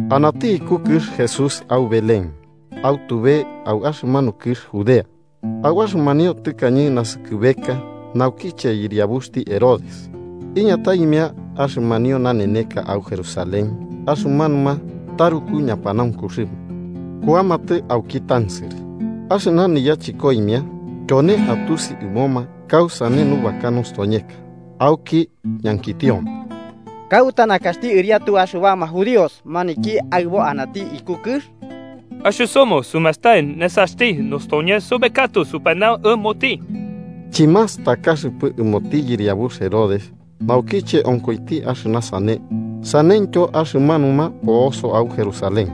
Anati iku kɨx Jesús au Belén, au tube au axɨmanu kɨx Judea, au axɨmanio tɨkañe naskɨbeka naukiche yɨriabuxti Herodes. Iñataimia axɨmanio naneka au Jerusalén axɨmanuma taruku ñapanaunkuxɨma kuamatɨ auki tansɨrɨ axɨna niyachɨkoimia tyone atusi ɨmoma kausane nubaka nostoñeka, auki ñankitioma: –¿Kauta nakaxti ɨriatu axɨbama judíos maniki aɨbo anati iku kɨx? Axɨsomɨ sumastai nesaxti nostoñes sobekatɨ supanau ɨmoti. Chimastakaxɨpɨ ɨmoti yɨriabux Herodes naukiche onkoiti axɨna sane, saneityo axɨmanuma po'osoma au Jerusalén.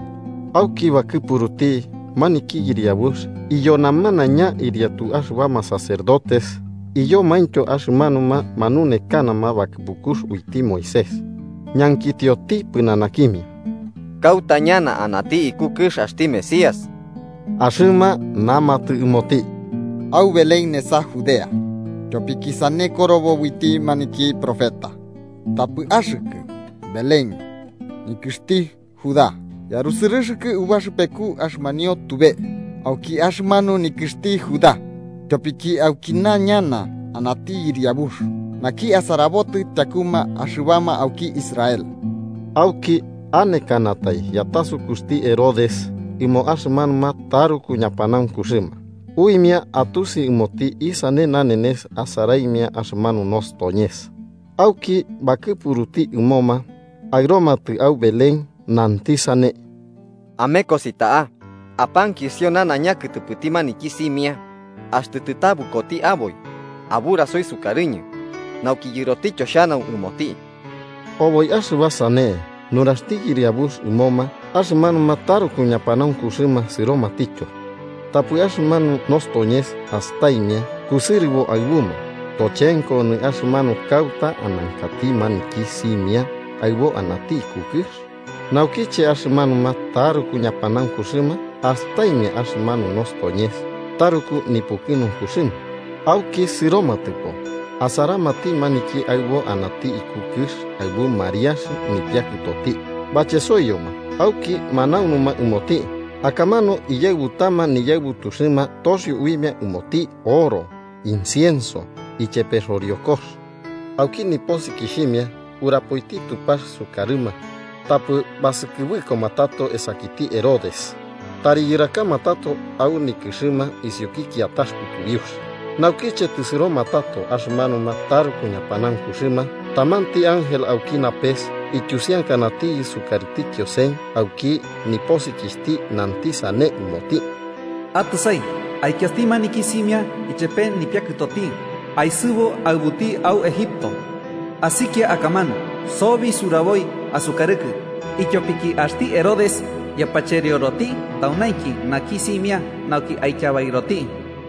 Auki bakɨpuruti maniki yɨriabux iyo namanaiña ɨriatu axɨbama sacerdotes iyomaintyo axɨmanuma manunekanama bakɨpukux uiti Moisés, ñankitioti pɨnanakimia kauta ñana anati iku kɨx axti Mesías. Axɨma namatɨ ɨmoti: –Au Belén nesa Judea. Tyopiki sane korobo uiti maniki profeta: ‘Tapɨ axɨkɨ, Belén, nikɨxti Judá, yarusɨrɨxɨkɨ ubaxɨpeku axɨmanio tube auki axɨmanu nikɨxti Judá. Tyopiki aukina ñana anati yɨriabux naki asarabotɨ tyakuma axɨbama auki Israel.’ Auki anekanatai yatasukuxti Herodes ɨmo axɨmanuma taruku ñapanaunkuxɨma, uimia atusi ɨmoti isane nanenes asaraimia axɨmanu nostoñes. Auki bakɨpuruti ɨmoma aɨromatɨ au Belén, nanti sane: –Amekosi ta'a, apankisio nanaiña kɨtɨpɨti maniki simia. Axtɨ tɨtabɨkoti aboi, aburasoi sukarɨñɨ, nauki yɨrotityo xhanau ɨmoti. Oboi axɨba sane nuraxti yɨriabux ɨmoma, axɨmanuma taruku ñapanaunkuxɨma sɨromatityo. Tapɨ axɨmanu nostoñes astaimia kusɨrɨbo aɨbuma, tochenko onɨ axɨmanu kauta anankati maniki simia aɨbo anati iku kɨx. Naukiche axɨmanuma taruku ñapanaunkuxɨma astaimia axɨmanu nostoñes, taruku nipukɨnunkuxɨma. Auki sɨromatɨpo, asaramati maniki aɨbo anati iku kɨx aɨbu Mariax nipiakɨtoti. Bachesoiyoma auki manaunuma ɨmoti. Akamanu iyaɨbutama niñaɨbutuxɨma toxio uimia ɨmoti oro, incienso ichepe xoriokox. Auki ñanukuxɨma urapoiti Tupax sukarɨma, tapɨ basɨkɨbɨkoma tato esakiti Herodes, tari yɨrakamatɨ tato au nikɨxɨma isiuki kiatax kutubiux. Naukiche tɨsɨromatɨ tato axɨmanuma taruku ñapanaunkuxɨma, tamanti ángel auki napes ityusiankanatiyɨ sukarɨti Kiosen auki ñanukuxti, nanti sane ɨmoti: “Atɨsai, aikiasti maniki simia ichepe nipiakɨtoti, aesɨbu aɨbuti au Egipto. Asikia akamanu sobi suraboi asukarɨkɨ, ityopiki axti Herodes yapacherioroti taunainki naki simia nauki aityabairoti.”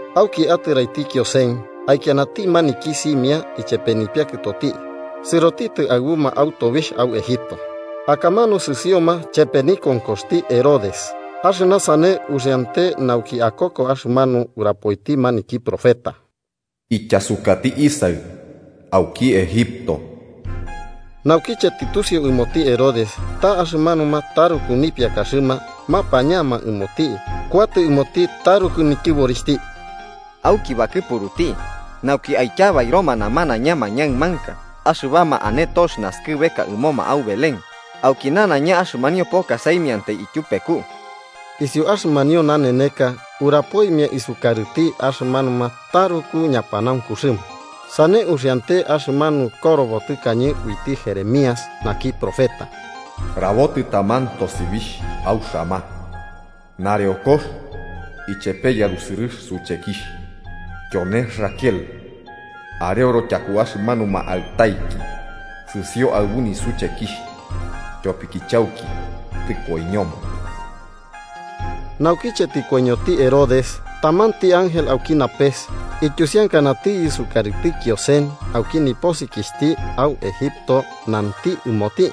Auki atɨraiti Kiosen, aikianati maniki simia ichepe nipiakɨtoti, sɨrotitɨ aɨbuma au tobixh au Egipto, akamanu sɨsioma chepe nikonkoxti Herodes. Axɨna sane uxiante nauki akoko axɨmanu urapoiti maniki profeta: “Ityasukati Isaɨ auki Egipto.” Naukiche tɨtusiu ɨmoti Herodes ta axɨmanuma taruku nipiakaxɨma mapañama ɨmoti, kuatɨ ɨmoti taruku nityɨborixhti, auki bakɨpuruti nauki aityabairoma namanaiña mañaɨmanka axɨbama ane tox naskɨbeka ɨmoma au Belén, auki nanaiña axɨmanio poka saimiantai ityupeku, isiu axɨmanio naneneka urapoimia isukarɨti axɨmanuma taruku ñapanaunkuxɨma. Sane uxiante axɨmanu korobo tɨkañe uiti Jeremías, naki profeta: “Rabotɨ taman tosibixh au Ramá, nareokox ichepe yarusɨrɨx suchekixh. Tyone Raquel, areoro tyaku axɨmanuma aɨtaiki sɨsio aɨbu nisuchekixh tyopiki chauki tɨkoiñoma.” Naukiche tɨkoiñoti Herodes, tamanti ángel auki napes ityusiankanatiyɨ sukarɨti Kiosen auki ñanukuxti, au Egipto, nanti ɨmoti: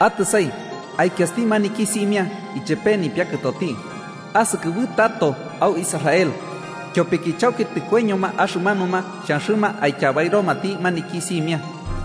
“Atɨsai, aikiasti maniki simia ichepe nipiakɨtoti, asɨkɨbɨtato au Israel, tyopiki chauki tɨkoiñoma axɨmanuma xhanxɨma aityabairomati maniki simia.”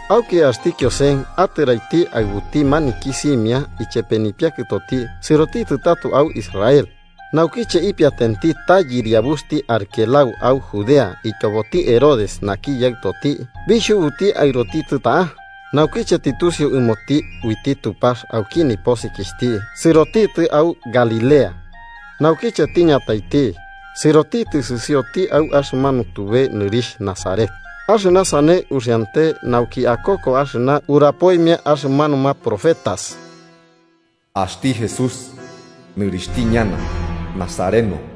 Auki axti Kiosen atɨraiti aɨbuti maniki simia ichepe nipiakɨtoti sɨrotitɨ tato au Israel. Naukiche ipiatenti ta yɨriabuxti Arquelao au Judea ityoboti Herodes naki yaɨtoti, bixhubuti aɨrotitɨ ta'a. Naukiche tɨtusiu ɨmoti uiti Tupax auki niñanukuxti, sɨrotitɨ au Galilea. Naukiche tiñataiti, sɨrotitɨ sɨsioti au axɨmanu tube nɨrixh Nazaret. Axɨna sane uxiante nauki akoko axɨna urapoimia axɨmanuma profetas: axti Jesús nɨrixhti ñana Nazareno.